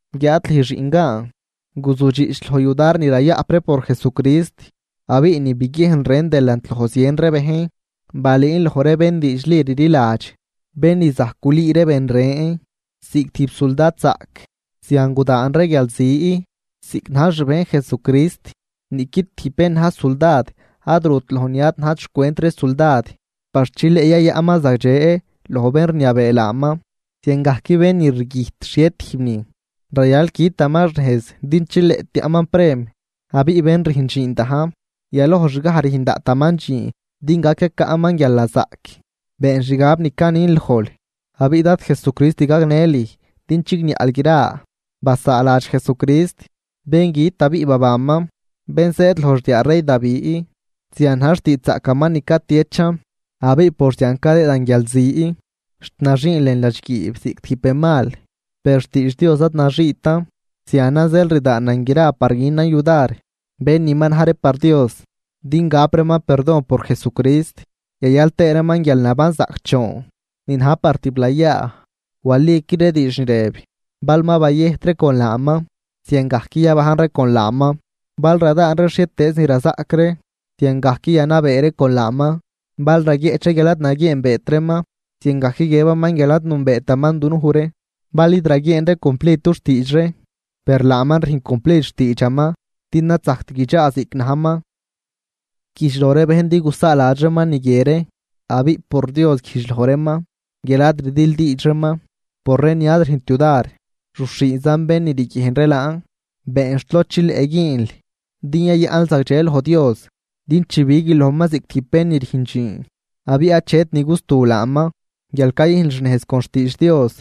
Guiáad lüj xiꞌngaan, guzujdxiꞌch loj yudar ni rayaꞌp ree por Jesucrist. Abiꞌ ni biguiejnl rën delant loj zien ree bejn, balüün loj ree bén diidxli rliladx, bén ni zajc gulüü ree ben ren. Ziꞌc tijb suldadzaꞌc, zian gudaan ree guialzi, ziꞌc najl xbejn Jesucrist. Niꞌqui tijb bén na̱j suldad ad rut loj ni ad najt xcwent ree suldad par chileꞌ yayaꞌnman zagdxe loj bén rniabee laaman. Ziangajc bén ni rguijt xhie tijb nin, rayal quitaman xnejz din chileꞌ tiaꞌman prem. Abiꞌ bén rüjn dxiin dajn, yaloj xgaj rüjn daꞌtaman dxiin din gac yacaꞌman guialnazaꞌc. Been xgab ni canin lojl, abiꞌ Dad Jesucrist gagnë lüj din chigniaꞌl gra. Basaaladx Jesucrist, bén güt abiꞌ babanman, bén zëëd loj xdiaa rey Davi, zian na̱j xtiidxzaꞌcaman ni catiechan. Abiꞌ por zian cadëëdan guialzi, xt naxiin lën ladxguiib ziꞌc tijb benmal, per xtiidx Dios ad naxiitan. Zianan zeel rdaanan gra par günan yudar bén ni ma na̱j ree par Dios, din gap reeman perdon por Jesucrist yayal tëë reeman guialnaban zaꞌcdxoon ni na̱j par tiblayaa. Waliqui ree diidx ni rëb: Bal ma bayëjt ree con laaman, ziangajc yabajn ree con laaman. Bal radaan ree xhietëëz ni razaꞌc ree, ziangajc yanabee ree con laaman. Bal raguieꞌch ree guial ad naguieenbeet reeman, ziangajc guiëbaman guial ad nünbeetaman dunuj ree. Bal id raguieen ree cumplid dux tiidx ree, per laaman rüjn cumplid xtiidxaman din ad zajct guidxaa ziꞌc najman. Güjdx loj ree bejn din gusaaladx reeman ni guie ree, abiꞌ por Dios güjdx loj reeman guial ad rdildiidx reeman por ree ni ad rüjnt yudar, ruxhiinzan bén ni riguiejn ree laan. Been xt lod chileꞌ güünl din yayaꞌnl zagdxe loj Dios, din chibiguil lojman ziꞌc tijb bén ni rüjn dxiin abiꞌ achet ni gustu laaman, guial cayüjnl xnejz con xtiidx Dios.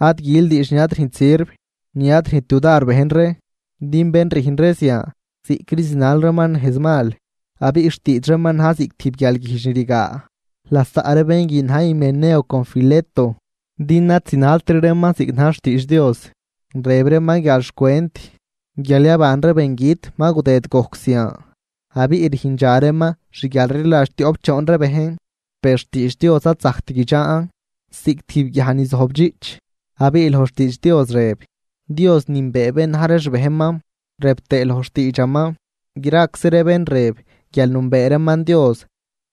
Ad gül diidx ni ad rüjnt sirv, ni ad rüjnt yudar bejn ree. Din bén rüjn ree zian ziꞌcri zinal reeman nejz mal, abiꞌ xtiidx reeman na̱j ziꞌc tijb guialguijdx ni rigaa. Lasaꞌ ree bén guin na̱j Himeneo con Fileto, din ad zinaltri reeman ziꞌc na̱j xtiidx Dios. Rëb reeman guial xcwent guial yaban ree bengüt mal gudëd gojc zian, abiꞌ rüjndxa reeman xguialrliladx tioꞌp choon ree bejn. Per xtiidx Dios ad zajct guidxaan ziꞌc tijb guiaj ni zojbdxiꞌch. Abiꞌ loj xtiidx Dios rëb: “Dios nünbee bén na̱j ree xbejnman”, rëb tëë loj xtiidxaman: “Graczi ree bén rëb guial nünbee reeman Dios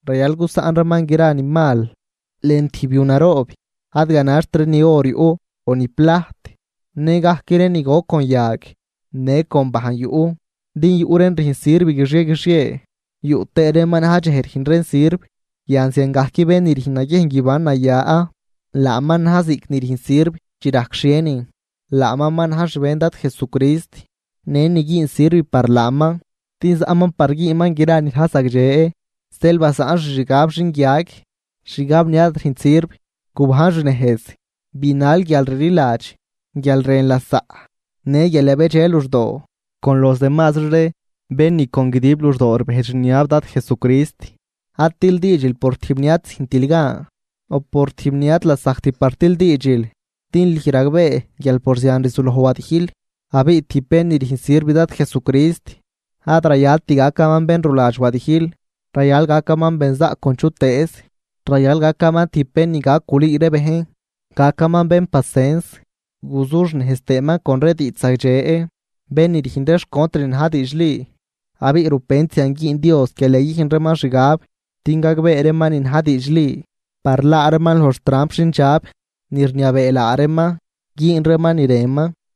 rayal gusaꞌn reeman gra ni mal.” Lën tijb yu naroob, ad ganaxt ree ni or yuꞌ o ni plajt, nëgajc ree ni goc con yag në con bajn yuꞌ. Din yuꞌ reen rüjn sirv guixie guixie, yuꞌ tëë reen ma na̱j dxej rüjn reen sirv. Yan ziangajc bén ni rüjn naguiejn guiban naya, laaman na̱j ziꞌc ni rüjn sirv chi rajc xhienin, laaman ma na̱j xbejn Dad Jesucrist në ni güün sirv par laaman, din zaꞌman par güünman gra ni na̱j zagdxe. Zeel basaꞌn xixgab xinguiag, xgab ni ad rüjnt sirv, gubajn xnejz. Binal guialrliladx, guialrën lasaꞌ në guial yabedxe luxdoo con los demasri ree bén ni con guidib luxdoo rbejdx rniab Dad Jesucrist. Ad tildiidxil por tijb ni ad züjntil gan, o por tijb ni ad lasajct par tildiidxil, din lüj ragbee guial por zian rzuloj wadijl. Abiꞌ tijb bén ni rüjn sirv Dad Jesucrist ad rayalt gacaman bén ruladx wadijl, rayal gacaman benzaꞌc con chutëëz, rayal gacaman tijb bén ni gac gulüü ree bejn, gacaman bén pacens guzuxnejz tëëman con ree diidxzagdxe bén ni rüjn ree xcontr ni na̱j diidxli. Abiꞌ rupent zian güün Dios guial yayüjn reeman xgab din gagbee reeman ni na̱j diidxli. Par laa reeman loj xtramp xindxab ni rniabee laa reeman güün reeman ni rënman.